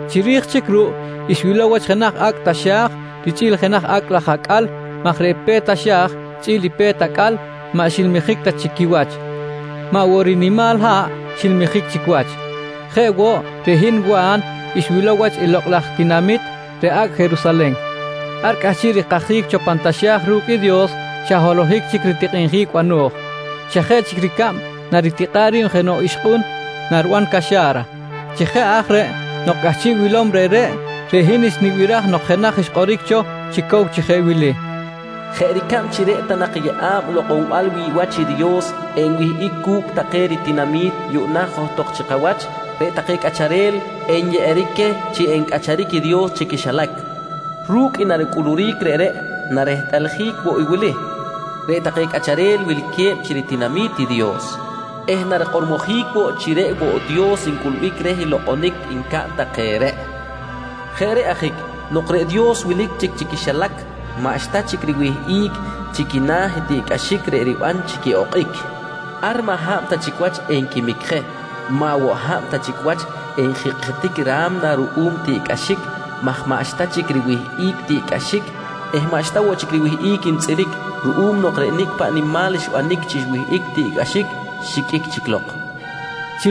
Chiri̱j chic ruꞌ, xwilow wach jenaj acꞌ taxa̱j richꞌi̱l jenaj acꞌ laj acꞌal maj reꞌ pe̱t taxa̱j richꞌi̱l i pe̱t acꞌal maꞌ xilmijic ta chic quiwach, maꞌ woꞌ reꞌ rinimal haꞌ xilmijic chic wach. Jeꞌ woꞌ, reꞌ hin Wa̱n xwilow wach i lokꞌ laj tinamit, reꞌ Acꞌ Jerusalen. Ar cꞌahchiꞌ rikajic cho pan taxa̱j ru̱cꞌ i Dios, xa holohic chic ritikꞌinjic bano̱j, xa jeꞌ chic ricab naritikꞌa̱ꞌ ri̱b jenoꞌ ixkꞌun nariban caxa̱ra. Chi jeꞌ aj reꞌ nok cꞌahchiꞌ wilom reꞌreꞌ, reꞌ hin xnibiraj nok jenaj xkꞌoric cho chi cow chi jeꞌ wili: «Jeꞌ ricab chi reꞌ ta nak i yeꞌa̱b lokꞌonbal wi̱ꞌ wach i Dios enwihꞌic cu̱cꞌ take ritinami̱t, yuꞌna johtok chi kawach reꞌ take cꞌacharel nyeꞌeric queh chi encꞌacharic i Dios chi quixilac. Ru̱cꞌ i naricꞌuluric reꞌreꞌ narehtꞌaljic woꞌ i wili: Reꞌ take cꞌacharel wilque̱b chi ritinami̱t i Dios eh narikꞌormojic woꞌ chi reꞌ woꞌ Dios ncꞌulbic reh i lokꞌonic ncaꞌn take reꞌ. Jeꞌ reꞌ ajic, nok reꞌ Dios wilic chic chi cꞌacharic chi quixilac, maꞌxta chic riwihꞌic chi quina̱ i tiꞌcꞌaxic reꞌ riban chi quiꞌokꞌic. Ar maꞌ hab ta chic wach enquimic je, maꞌ woꞌ hab ta chic wach enjikꞌjitic i ra̱mna ruꞌum tiꞌcꞌaxic maj maꞌxta chic riwihꞌic tiꞌcꞌaxic eh maꞌxta woꞌ chic riwihꞌic ntzꞌiric ruꞌum nok reꞌ nicꞌ paꞌ nimal xbanic chi xwihꞌic i tiꞌcꞌaxic, xiqꞌuic chic lok, nqui xikꞌor.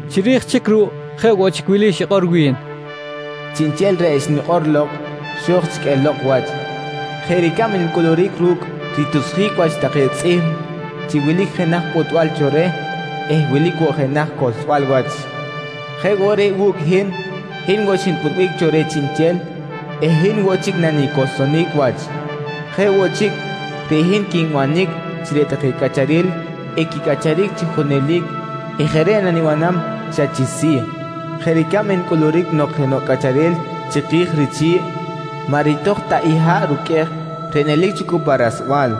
Chiri̱j chic ruꞌ jeꞌ woꞌ chic wili xikꞌor wi̱n: «Chiꞌnchel reꞌ xnikꞌor lok, xo̱j chic elok wach. Jeꞌ ricab ncꞌuluric ru̱cꞌ ritusjic wach take tzꞌihm chi wilic jenaj pꞌutbal cho reh eh wilic woꞌ jenaj cohlsbal wach, jeꞌ woꞌ reꞌ wu̱cꞌ i hin, hin woꞌ xinpꞌutbic cho reh chiꞌnchel eh hin woꞌ chic nanicohlsonic wach. Jeꞌ woꞌ chic, reꞌ hin quinbanic chi reꞌ take cꞌacharel equicꞌacharic chi junelic eh jeꞌ reꞌ nanibanam xa chi si̱ jeꞌ ricab ncꞌuluric nok jenoꞌ cꞌacharel chiki̱j richi̱ꞌ, maꞌ ritoj ta i haꞌ ruqꞌuej reꞌ nelic cho cu pa rasbal.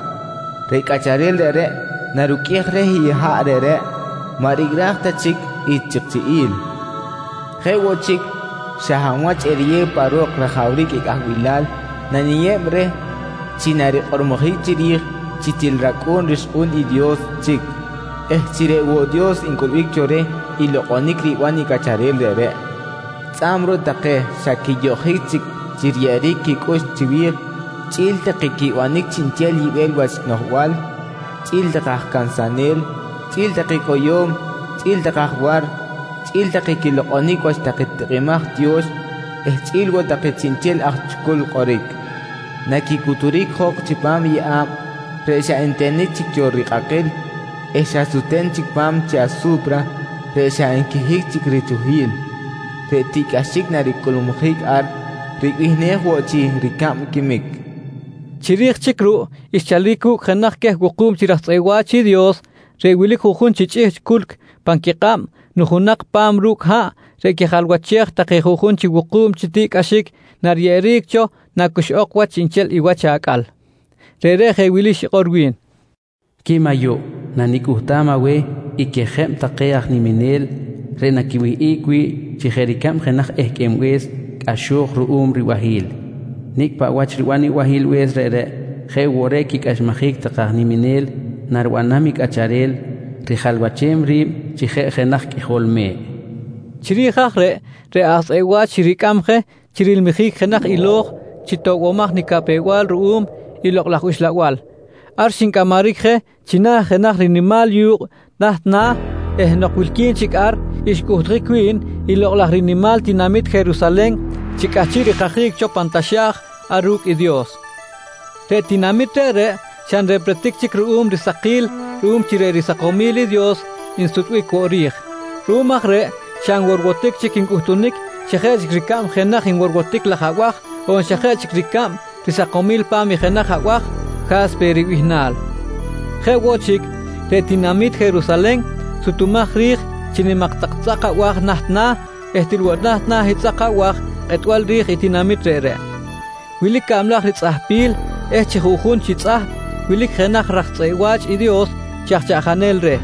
Reꞌ cꞌacharel reꞌreꞌ naruqꞌuej reh i haꞌ reꞌreꞌ, maꞌ ricꞌraj ta chic i chikchiꞌi̱l. Jeꞌ woꞌ chic, xa hab wach eriyew pa ro̱k rajawric i cꞌahbilal naniyeb reh chi narikꞌormojic chiri̱j chi til racꞌu̱n rixkꞌu̱n i Dios chic eh chi reꞌ woꞌ Dios ncꞌulbic cho reh i lokꞌonic riban i cꞌacharel reꞌreꞌ. Tzꞌa̱b ruꞌ take xa quiyoꞌjic chic chi riyeꞌeric quicꞌux chiwi̱j chꞌi̱l take quibanic chiꞌnchel yibel wach noꞌjbal, chꞌi̱l take aj cansanel, chꞌi̱l take cꞌoyo̱m, chꞌi̱l take aj war, chꞌi̱l take quilokꞌonic wach take tikꞌimaj tiyo̱x eh chꞌi̱l woꞌ take chiꞌnchel aj chucul kꞌoric, naquicuturic jok chipam i yeꞌa̱b reꞌ xa ntenic chic cho rikꞌakꞌil eh xa sute̱n chic pa̱m chi asu̱pra reꞌ xa nquihic chic richuhil. Reꞌ tiꞌcꞌaxic naricꞌulmujic ar ribihnej woꞌ chi “Ricab Quimic”, nqui xikꞌor. Chiri̱j chic ruꞌ xchalic wu̱cꞌ jenaj queh wuku̱b chi raj tzꞌeꞌ wa̱ch i Dios reꞌ wilic juꞌjun chi chꞌihchꞌ culc pan quikꞌab nujunak pa̱m ru̱cꞌ haꞌ reꞌ quijalwachej take juꞌjun chi wuku̱b chi tiꞌcꞌaxic nariyeꞌeric cho nacuxꞌok wach chiꞌnchel i wach acꞌal. Reꞌreꞌ jeꞌ wili xikꞌor wi̱n: «Quim ayuꞌ, nanicꞌuhtam aweh i quiyeꞌa̱b take aj niminel reꞌ naquiwihꞌic wi̱ꞌ chi jeꞌ ricab jenaj ehqꞌuenbe̱s cꞌaxo̱j ruꞌum ribahi̱l. Nicꞌ paꞌ wach riban i bahilbe̱s reꞌreꞌ, jeꞌ woꞌ reꞌ quicꞌaxmajic take aj niminel nariban i Cꞌacharel rijalwachem ri̱b chi jeꞌ jenaj Qꞌuijol Me̱ꞌ, nqui wi̱n. Chiri̱j aj reꞌ, reꞌ aj tzꞌeꞌ wa̱ch xiricꞌam je chi rilmijic jenaj ilo̱j chi toꞌbomaj nicapew-bal ruꞌum i Lokꞌ laj Uxlabal. Ar xincꞌamaric je china̱ jenaj rinimal yu̱kꞌ naht na̱ eh nok wilqui̱n chic ar xcꞌuhtjic wi̱n i lokꞌ laj rinimal tinamit Jerusalen chi cꞌahchiꞌ rikajic cho pan taxa̱j ar ru̱cꞌ i Dios. Reꞌ tinamit reꞌreꞌ xa nrepretic chic ruꞌum risakil ruꞌum chi reꞌ risakomil i Dios nsutbic woꞌ ri̱j. Ruꞌum aj reꞌ xa nworwotic chic ncꞌutunic xa jeꞌ chic ricab jenaj nworwotic laj abaj on xa jeꞌ chic ricab risakomil pa̱m i jenaj abaj “Ja̱spe” ribihnal. Jeꞌ woꞌ chic, reꞌ tinamit Jerusalen sutumaj ri̱j chi nimak tak tzꞌak abaj naht na̱ eh til woꞌ naht na̱ i tzꞌak abaj kꞌetbal ri̱j i tinamit reꞌreꞌ. Wilic cablaj ritzꞌahpil eh chi chi̱ꞌ juꞌjun chi tzꞌahp wilic jenaj raj tzꞌeꞌ wa̱ch i Dios chi aj chaꞌjanel reh.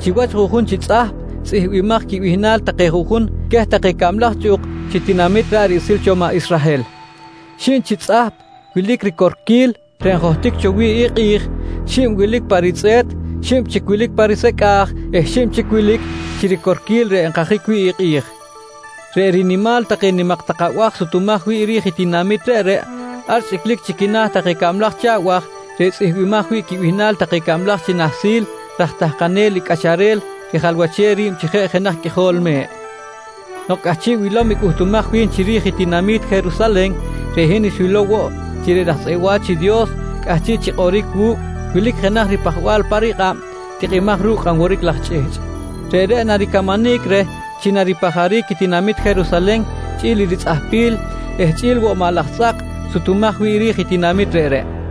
Chi wach juꞌjun chi tzꞌahp tzꞌihmbimaj quibihnal take juꞌjun queh take cablaj chꞌuk chi tinamit ra̱ꞌ riꞌsil cho maꞌ Israhel. Xib chi tzꞌahp wilic chi ricorquil reꞌ njohtic cho wi̱ꞌ i kꞌi̱j, xib wilic pa ritzꞌe̱t, xib chic wilic pa risecꞌa̱j eh xib chic wilic chi ricorquil reꞌ nkajic wi̱ꞌ i kꞌi̱j. Reꞌ rinimal take nimak tak abaj sutumaj wi̱ꞌ ri̱j i tinamit reꞌreꞌ, ar chꞌiclic chi quina̱ take cablaj chi abaj reꞌ tzꞌihmbimaj wi̱ꞌ quibihnal take cablaj chi nahsil raj tahkanel i Cꞌacharel rijalwachem ri̱b chi jeꞌ jenaj Qꞌuijol Me̱ꞌ. Nok cꞌahchiꞌ wilom i cꞌuhtumaj wi̱n chiri̱j i tinamit Jerusalen, reꞌ hin xwilow woꞌ chi reꞌ raj tzꞌeꞌ wa̱ch i Dios cꞌahchiꞌ chi kꞌoric wu̱cꞌ wilic jenaj ripajbal pa rikꞌab tikꞌimaj ru̱cꞌ kꞌan woric laj chꞌihchꞌ. Reꞌreꞌ naricamanic reh chi ripajaric i tinamit Jerusalen chꞌi̱l i ritzꞌahpil eh chꞌi̱l woꞌ maꞌ laj tzꞌak sutumaj wi̱ꞌ ri̱j i tinamit reꞌreꞌ.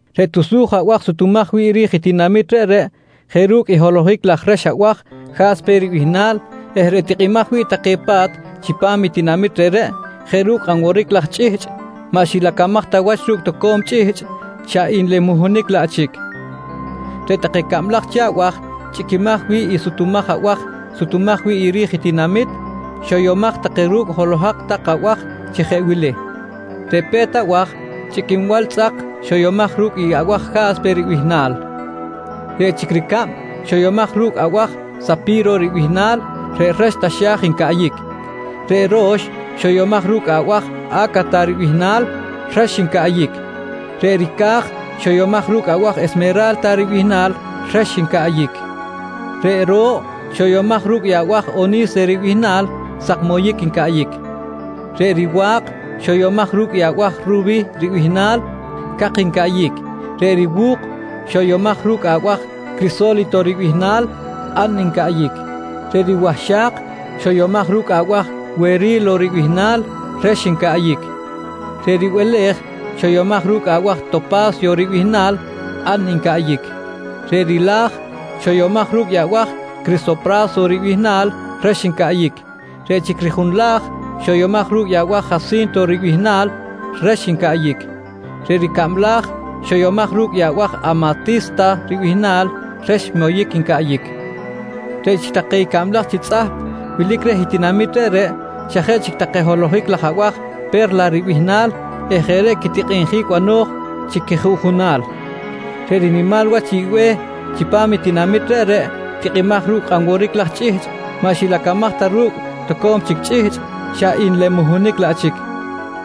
Reꞌ tusuj abaj sutumaj wi̱ꞌ ri̱j i tinamit reꞌreꞌ jeꞌ ru̱cꞌ i holohic laj rex abaj “Ja̱spe” ribihnal eh reꞌ tikꞌimaj wi̱ꞌ take pa̱t chipam tinamit reꞌreꞌ jeꞌ ru̱cꞌ kꞌan woric laj chꞌihchꞌ maꞌ xilacamaj ta wach ru̱cꞌ toco̱m chic chꞌihchꞌ, xa nlemuhunic laꞌ chic. Reꞌ take cablaj chi abaj chꞌiquimaj wi̱ꞌ i tusuj abaj sutumaj wi̱ꞌ ri̱j i tinamit, xoyomaj take ru̱cꞌ holohak laj abaj chi jeꞌ wili: Reꞌ pe̱t abaj chꞌiquinbal tzꞌak xoyomaj ru̱cꞌ i abaj “Ja̱spe” ribihnal. Reꞌ chic ricab, xoyomaj ru̱cꞌ abaj “Sapi̱ro” ribihnal reꞌ rex taxa̱j ncaꞌyic. Reꞌ ro̱x, xoyomaj ru̱cꞌ abaj “A̱kata” ribihnal rex ncaꞌyic. Reꞌ ricaj, xoyomaj ru̱cꞌ abaj “Esmera̱lta” ribihnal rex ncaꞌyic. Reꞌ ro̱ꞌ, xoyomaj ru̱cꞌ i abaj “Oni̱se” ribihnal sak moyic ncaꞌyic. Reꞌ riwa̱k, xoyomaj ru̱cꞌ i abaj “Rubi̱” ribihnal cak ncaꞌyic. Reꞌ riwu̱k, xoyomaj ru̱cꞌ abaj “Criso̱lito” ribihnal kꞌan ncaꞌyic. Reꞌ riwahxak, xoyomaj ru̱cꞌ abaj “Weri̱lo” ribihnal rex ncaꞌyic. Reꞌ ribele̱j, xoyomaj ru̱cꞌ abaj “Topa̱syo” ribihnal kꞌan ncaꞌyic. Reꞌ rila̱j, xoyomaj ru̱cꞌ i abaj “Crisopra̱so” ribihnal rex ncaꞌyic. Reꞌ chic rijunla̱j, xoyomaj ru̱cꞌ i abaj “Jasinto” ribihnal rex ncaꞌyic. Reꞌ ricabla̱j, xoyamaj ru̱cꞌ i abaj “Amati̱sta” ribihnal, rex moyic ncaꞌyic. Reꞌ chic take i cablaj chi tzꞌahp wilic reh i tinamit reꞌreꞌ xa jeꞌ chic take holohic laj abaj “Pe̱rla” ribihnal eh jeꞌ reꞌ quitikꞌinjic bano̱j chi quijuꞌjunal. Reꞌ rinimal wach i be̱h chipam tinamit reꞌreꞌ tikꞌimaj ru̱cꞌ kꞌan woric laj chꞌihchꞌ maꞌ xilacamaj ta ru̱cꞌ toco̱m chic chꞌihchꞌ, xa nlemuhunic laꞌ chic.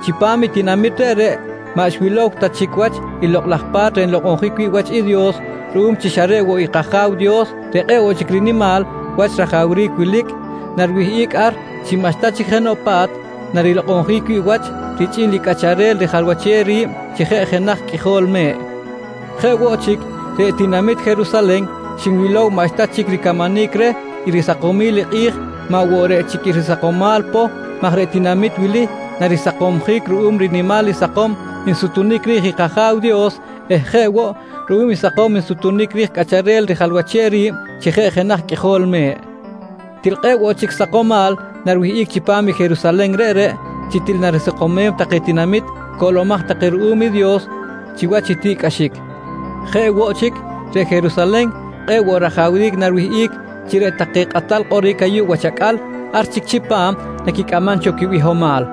Chipam i tinamit reꞌreꞌ maꞌ xwilow ta chic wach i Lokꞌ laj Pa̱t reꞌ nlokꞌonjic wi̱ꞌ wach i Dios ruꞌum chi xa reꞌ woꞌ i kAja̱w Dios reꞌ kꞌe̱ꞌ woꞌ chic rinimal wach rajawric wilic, nariwihꞌic ar chi maꞌxta chic jenoꞌ pa̱t narilokꞌonjic wi̱ꞌ wach richꞌi̱l i Cꞌacharel rijalwachem ri̱b chi jeꞌ jenaj Qꞌuijol Me̱ꞌ. Jeꞌ woꞌ chic, reꞌ tinamit Jerusalen xinwilow maꞌxta chic ricamanic reh i risakomal i kꞌi̱j maꞌ woꞌ reꞌ chic i risakomal poh maj reꞌ tinamit wili narisakomjic ruꞌum rinimal i sakom nsutunic ri̱j i kAja̱w Dios eh jeꞌ woꞌ ruꞌum i sakom nsutunic ri̱j Cꞌacharel rijalwachem ri̱b chi jeꞌ jenaj Qꞌuijol Me̱ꞌ. Til kꞌe̱ꞌ woꞌ chic sakomal nariwihꞌic chipam i Jerusalen reꞌreꞌ, chi til narisakomem take tinamit coꞌlomaj take ruꞌum i Dios chiwach i tiꞌcꞌaxic. Jeꞌ woꞌ chic, reꞌ Jerusalen kꞌe̱ꞌ woꞌ rajawric nariwihꞌic chi reꞌ take kꞌatal kꞌoric ayuꞌ wach acꞌal, ar chic chipam naquicꞌamam cho quibihomal.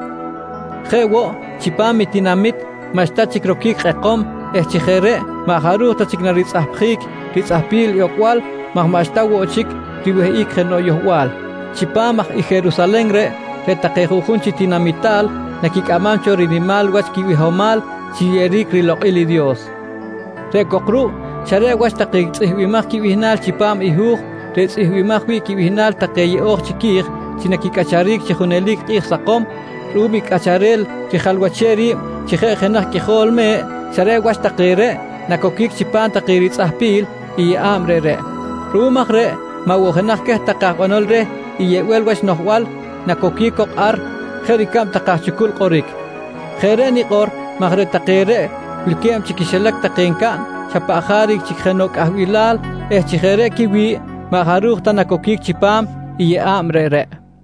Jeꞌ woꞌ, chipam i tinamit maꞌxta chic roquic kꞌekom eh chi jeꞌ reꞌ maꞌ jaruj ta chic naritzꞌapjic ritzꞌahpil i ocbal maj maꞌxta woꞌ chic riwihꞌic jenoꞌ yohbal. Chipam aj i Jerusalen reꞌ, reꞌ take juꞌjun chi tinamital naquicꞌamam cho rinimal wach quibihomal chi riyeꞌeric rilokꞌil i Dios, reꞌ cok ruꞌ, xa reꞌ wach take tzꞌihmbimaj quibihnal chipam i hu̱j reꞌ tzꞌihmbimaj wi̱ꞌ quibihnal take yeꞌo̱j chiqui̱j chi naquicꞌacharic chi junelic kꞌi̱j sakom ruꞌum i Cꞌacharel rijalwachem ri̱b chi jeꞌ jenaj Qꞌuijol Me̱ꞌ, xa reꞌ wach take reꞌ nacoquic chipam take ritzꞌahpil i yeꞌa̱b reꞌreꞌ. Ruꞌum aj reꞌ maꞌ jenoꞌ queh take aj banol reh i yibel wach noꞌjbal nacoquic cok ar, jeꞌ ricab take aj chucul kꞌoric. Jeꞌ reꞌ nikꞌor maj reꞌ take reꞌ wilque̱b chi quixilac take ncaꞌn xa paꞌ jaric chic jenoꞌ cꞌahbilal eh chi jeꞌ reꞌ quiwi̱ꞌ maꞌ jaruj ta nacoquic chipam i yeꞌa̱b reꞌreꞌ.